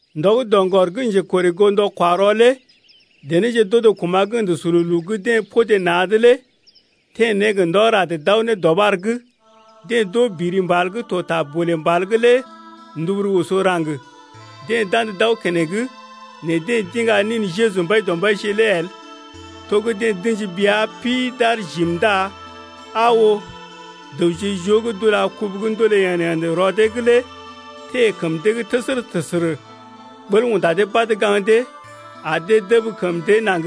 Ndɔ gə́ doŋgɔr gə́ njekorè goo ndɔ-kwa-rɔ lé denéje d’odo kuma̰ gə́ ə̰də sululu gə́ deḛ podé na̰’d lé teḛ ne gə ndɔ rad d’aw ne dɔɓar’g. Deḛ d’oo biri mbal gə́ to ta bolè mbal’g lé nduburu oso raŋg. Deḛ d’andə d’aw keneŋ nɛ deḛ d’iŋga nin Jeju Mbaidɔmbaije lé el. To gə́ deḛ d’ə̰ji bea pi d’aar jim ndá aa oo, dəwje joo gə́ d’ula kubu gə́ ndoolé yḛd-yḛd rɔ dee’g lé teḛ kəm dee’g təsərə-təsərə. Ɓəl unda dee badə gaŋg dee ar dee dəb kəm dee naŋg,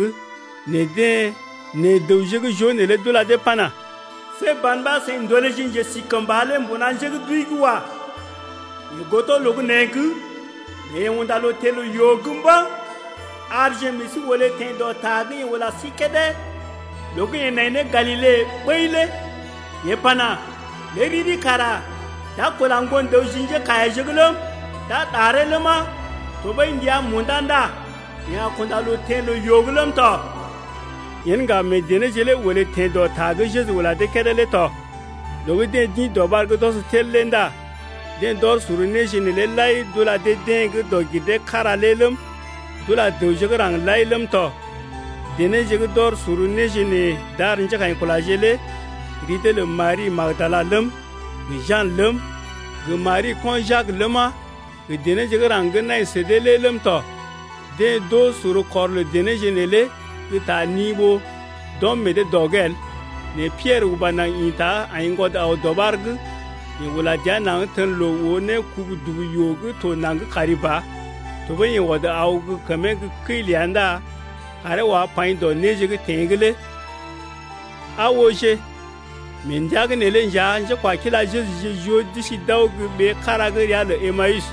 nɛ dəwje gə́ joo neelé d’ula dee pana: See ban ɓa seḭ ndolèje njesikəmba lé mbuna njé gə́ d’wəi’g wa. Yeḛ godo loo gə́ nee’g nɛ yeḛ unda loo teḛ loo-yoo’g mba̰. Arje meḛ sí olé teḛ dɔ ta gə́ yeḛ ula sí kédé loo gə́ yeḛ nai ne Galile ɓəi lé yeḛ pana: Lé riri kara d’a kula Ŋgon-dəw ji njékaiyaje’g ləm, d’a ɗaree ləma, tɔɓəi ndəa munda ndá yeḛ a kunda loo teḛ loo-yoo’g ləm tɔ. Yen ŋga meḛ denéje lé olé teḛ dɔ ta gə́ Jeju ula dee kédé lé tɔ. Loo gə́ deḛ d’ḭ dɔɓar’g d’ɔs tel lé ndá deḛ d’ɔr sor néje neelé lai d’ula dee-deḛ gə́ dɔg-gir-dee-kára lé ləm, d’ula dəwje gə́ raŋg lai ləm tɔ. Denéje gə́ d’ɔr sor néje nee d’ar njékaḭkulaje lé ri dee lə Mari gə́ Magdala ləm, gə Jan ləm, gə Mari ko̰ Jak ləma, gə denéje gə́ raŋg gə́ nai sə dee lé ləm tɔ. Deḛ d’oo sor kɔr lə denéje neelé gə́ ta ni ɓó d’ɔm meḛ dee dɔ’g el. Nɛ Piɛrə uba naŋg ḭta aiŋgwɔd aw dɔɓar’g. Yeḛ ula dəa naŋg tən loo oo ne kubu-dubu-yoo gə́ to naŋg kari ba. Tɔɓəi yeḛ ɔd aw gə́ kəmee gə́ kəi ləa ndá kaaree wá paḭ dɔ néje gə́ teḛ’g lé. Aa ooje, mee ndəa’g neelé nja njékwakila Jejuje joo d’isi d’aw gə́ ɓee kára gə́ ria lə Emawus.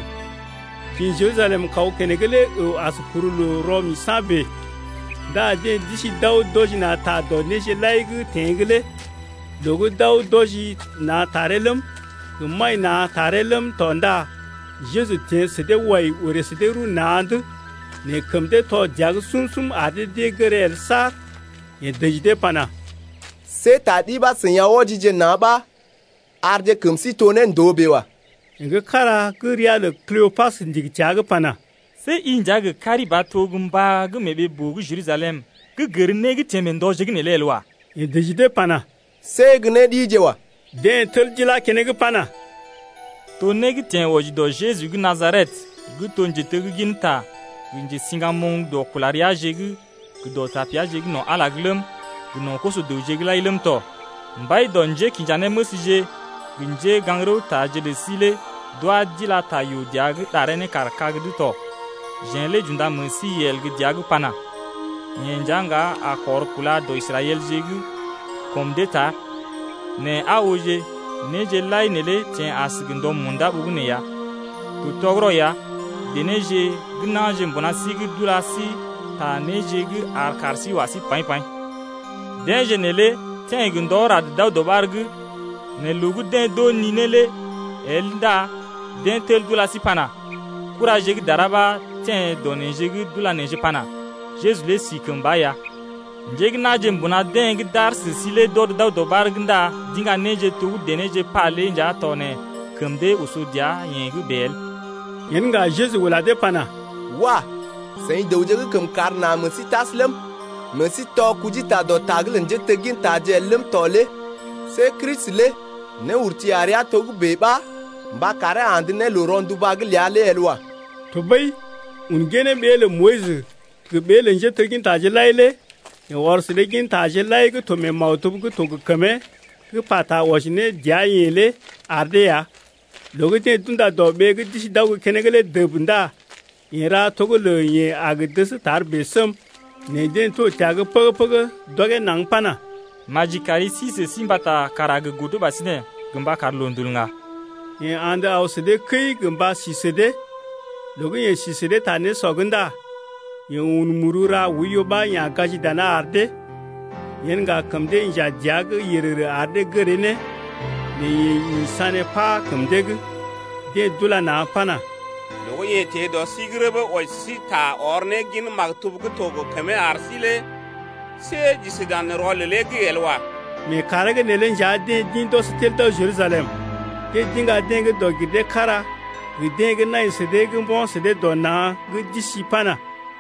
Kḭ Jerusalem kaw keneŋ lé əw as kuru loo dɔg-giree-kára bèe. Ndá deḛ d’isi d’aw d’wɔji na̰ ta dɔ néje lai gə́ teḛ’g lé. Loo gə́ d’aw d’wɔji na̰ taree ləm, gə maḭ na̰ taree ləm tɔ ndá Jeju teḛ sə dee wai orè sə dee rəw na̰’d. Nɛ kəm dee tɔ dəa’g sum-sum ar dee d’ée gəree el saar. Yeḛ dəji dee pana: See ta ɗi ɓa seḭ aw wɔjije na̰ ɓa arje kəm sí to ne ndòo bèe wa. Yeḛ gə́ kára gə́ ria lə Kleopas ndigi təa’g pana: See i nja gə kari ba to gə́ mbá gə́ mee ɓee-boo gə́ Jerusalem gə́ gər né gə́ teḛ mee ndɔje’g neelé el wa. Yeḛ dəji dee pana: See gə́ né ɗije wa. Deḛ tel d’ilá keneŋ pana: To né gə́ teḛ wɔji dɔ Jeju gə́ Najaret gə́ to njetegginta gə njesiŋgamoŋ dɔ kula reaje’g gə dɔ tapeaje’g no̰ Ala’g lé ləm, gə no̰ koso-dəwje’g lai ləm tɔ. Mbai dɔ njékinjanéməsje-je gə njégaŋ-rəwtaje lə sí lé d’wá d’ilá ta yoo dəa’g ɗaree ne kar kag’d tɔ. Jeḛ lé j’unda meḛ sí yel gə́ dəa’g n’pana: Yeḛ nja ŋga a kɔr kúla dɔ Israɛlje’g kɔm dee tar, nɛ aa oo néje lai neelé teḛ as gə ndɔ munda ɓogənè ya. To tɔgərɔ ya, denéje gə́ na̰je mbuna sí’g d’ula sí ta néje gə́ ar kaar sí wa sí ne paḭ-paḭ, deḛje neelé teḛ gə ndɔ rad d’aw dɔɓar’g, nɛ loo gə́ deḛ d’oo ninee lé el ndá deḛ tel d’ula sí pana: Kuraje gə́ dara ɓa teḛ dɔ neḛje’g d’ula neḛje pana: Jeju lé si kəmba ya. Njé gə́ na̰je mbuna deḛ gə́ d’aar sə sí lé d’ɔd d’aw dɔɓar’g ndá d’iŋga néje to gə́ denéje pa lé nja tɔ nɛ kəm dee oso dəa-yeḛ’g bèe el. Yen ŋga Jeju ula dee pana: Wah! seḭ dəwje gə́ kəmkàr na meḛ sí tas ləm, meḛ sí tɔ kujita dɔ ta’g lə njéteggintaje el ləm tɔ lé. See Kristi lé néurti a rəa togə́bè ɓa mba karee andə ne loo-ronduba’g ləa lé el wa. Tɔɓəi un ginee ɓee lə Moyis gə ɓee lə njéteggintaje lai lé yeḛ ɔr sə dee gintaje lai gə́ to mee maktub gə́ to gə kəmee gə́ pata wɔji ne dəa-yeḛ lé ar dee ya. Loo gə́ deḛ d’unda dɔ ɓee gə́ d’isi d’aw gə́ keneŋ lé dəb ndá yeḛ ra to gə́ lə yeḛ a gə dəs tar bèe səm. Nɛ deḛ to təa’g pəgə-pəgə d’ɔgee naŋg pana: Maji kari sí sə sí mbata kàr a gə godo ɓasinè gə mba kar loondul ŋga. Yeḛ andə aw sə dee kəi gə mba si sə dee ya tɔ. Loo gə́ yeḛ si sə dee ta nésɔ’g ndá yeḛ un muru ra oiyo ɓa ya̰ gaji dana ar dee. Yen ŋga kəm dee inja dəa’g yərərə ar dee gəree ne, nɛ yeḛ ḭ sané pá kəm dee’g. Deḛ d’ula na̰ pana: Loo gə́ yeḛ teḛ dɔ sí’g rəbə wɔji sə sí ta ɔr ne gin maktub gə́ to gə kəmee ar sí lé see j’isi dan rɔlelee’g el wa. Mee kàree’g neelé nja deḛ d’ḭ d’ɔs tel d’aw Jerusalem. Deḛ d’iŋga deḛ gə́ dɔg-gir-dee-kára gə deḛ gə́ nai sə dee gə́ mbo̰ sə dee dɔ na̰ gə́ d’isi pana: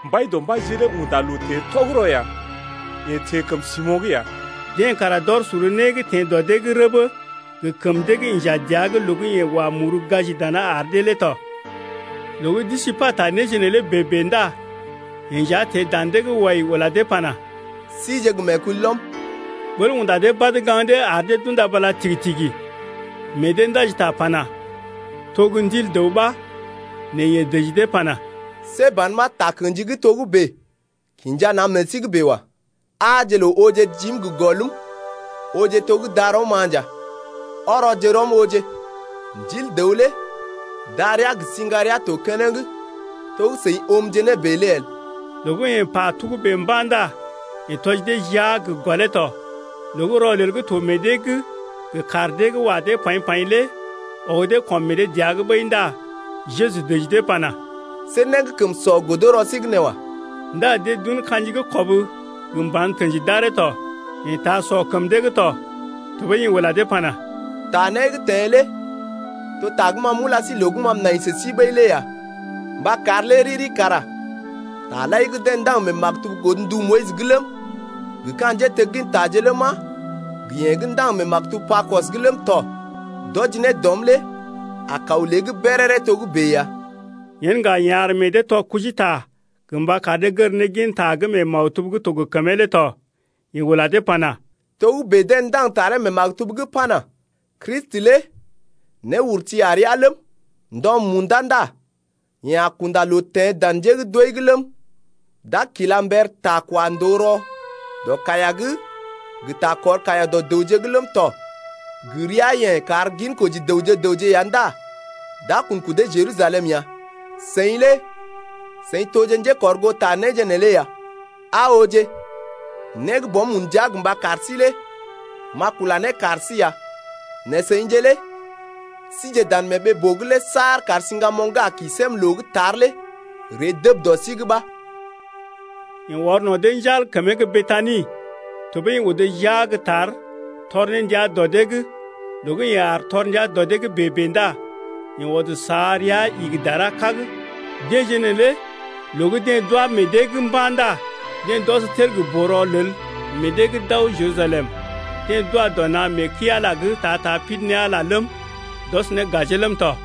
Mbaidɔmbaije lé unda loo teḛ tɔgərɔ ya. Yeḛ teḛ kəm Simo̰’g ya. Deḛ kara d’ɔr sor né gə́ teḛ dɔ dee’g rəbə gə kəm dee gə́ inja dəa’g loo gə́ yeḛ wa muru gaji dana ar dee lé tɔ. Loo gə́ d’isi pata néje neelé bèe-bèe ndá yeḛ nja teḛ dan dee’g wai ula dee pana: Sije gə meekulɔm. Ɓəl unda dee badə gaŋg dee ar dee d’unda bala tigi-tigi, meḛ dee ndaji ta pana: To gə́ ndil dəw ɓa. Nɛ yeḛ dəji dee pana: See ban ɓa takə̰ji gə́ togə́bè kinja na̰ meḛ sí’g bèe wa. Aaje loo ooje jim gə gɔlm, ooje to gə́ darɔm-ma nja, ɔrɔje rɔm ooje, ndil dəw lé darəa gə siŋgarea to keneŋ to gə́ seḭ oomje nee bèe lé el. Loo gə́ yeḛ pa togə́bè mba̰ ndá yeḛ tɔji dee jia gə gɔlee tɔ. Loo gə́ rɔlel gə́ to meḛ dee’g gə kaar dee gə́ wa dee paḭ-paḭ lé ɔg dee kɔm meḛ dee dəa’g ɓəi ndá Jeju dəji dee pana: See né gə́ kəm sɔ godo rɔ sí’g nee wa. Ndá deḛ d’un ka̰ji gə́ kɔb gə mban tə̰ji d’aree tɔ. Yeḛ taa sɔ kəm dee’g tɔ. Tɔɓəi yeḛ ula dee pana: Ta né gə́ teḛ lé to ta gə́ ma m’ula sí loo gə́ ma m’nai sə sí ɓəi lé ya, mba kar lé riri kara taje lai gə́ deḛ ndaŋg mee maktub godndu Moyis’g ləm, gə ka̰ njéteggintaje ləma, gə yee gə́ ndaŋg mee maktub Pakɔs’g ləm tɔ d’wɔji ne dɔm lé a kaw lée’g béréré togə́bè ya. Yen ŋga yeḛ ar meḛ dee tɔ kujita gə mba kar dee gər ne gin ta gə́ mee maktub gə́ to gə kəmee lé tɔ. Yeḛ ula dee pana: Togə́bè deḛ ndaŋg taree mee maktub’g pana: Kristi lé néurti a rəa ləm, ndɔ munda ndá yeḛ a kunda loo teḛ dan njé gə́ d’wəi’g ləm, d’a kila mber ta kwa ndòo rɔ dɔ kaiya’g gə ta kɔr kaiya dɔ dəwje’g ləm tɔ gə ria-yeḛ kar ginkoji dəwje gə raŋg ya ndá d’a kun kudee Jerusalem ya. Seḭ lé seḭ toje njékɔrgoota néje neelé ya. Aa ooje, né gə́ Bɔm un ndia gə mba kar sí lé m’a kula ne kar sí ya, nɛ seḭje lé sije dan mee ɓee-boo’g lé saar kar siŋgamoŋ gə́ a kḭ sém loo gə́ tar lé ree dəb dɔ sí’g ɓa. Yeḛ ɔr no̰ dee njal kəmee gə́ Betani, tɔɓəi yeḛ odo jia gə́ tar tɔr ne ndia dɔ dee’g. Loo gə́ yeḛ aar tɔr ndia dɔ dee’g bèe-bèe ndá yeḛ ɔd sa rəa igi dara kag. Deḛje neelé loo gə́ deḛ d’wá meḛ dee’g mba̰ ndá deḛ d’ɔs tel gə boo-rɔlel meḛ dee’g d’aw Jerusalem. Deḛ d’wa dɔ na̰ mee kəi-Ala’g ta-ta pidi ne Ala ləm, d’ɔs ne gajee ləm tɔ.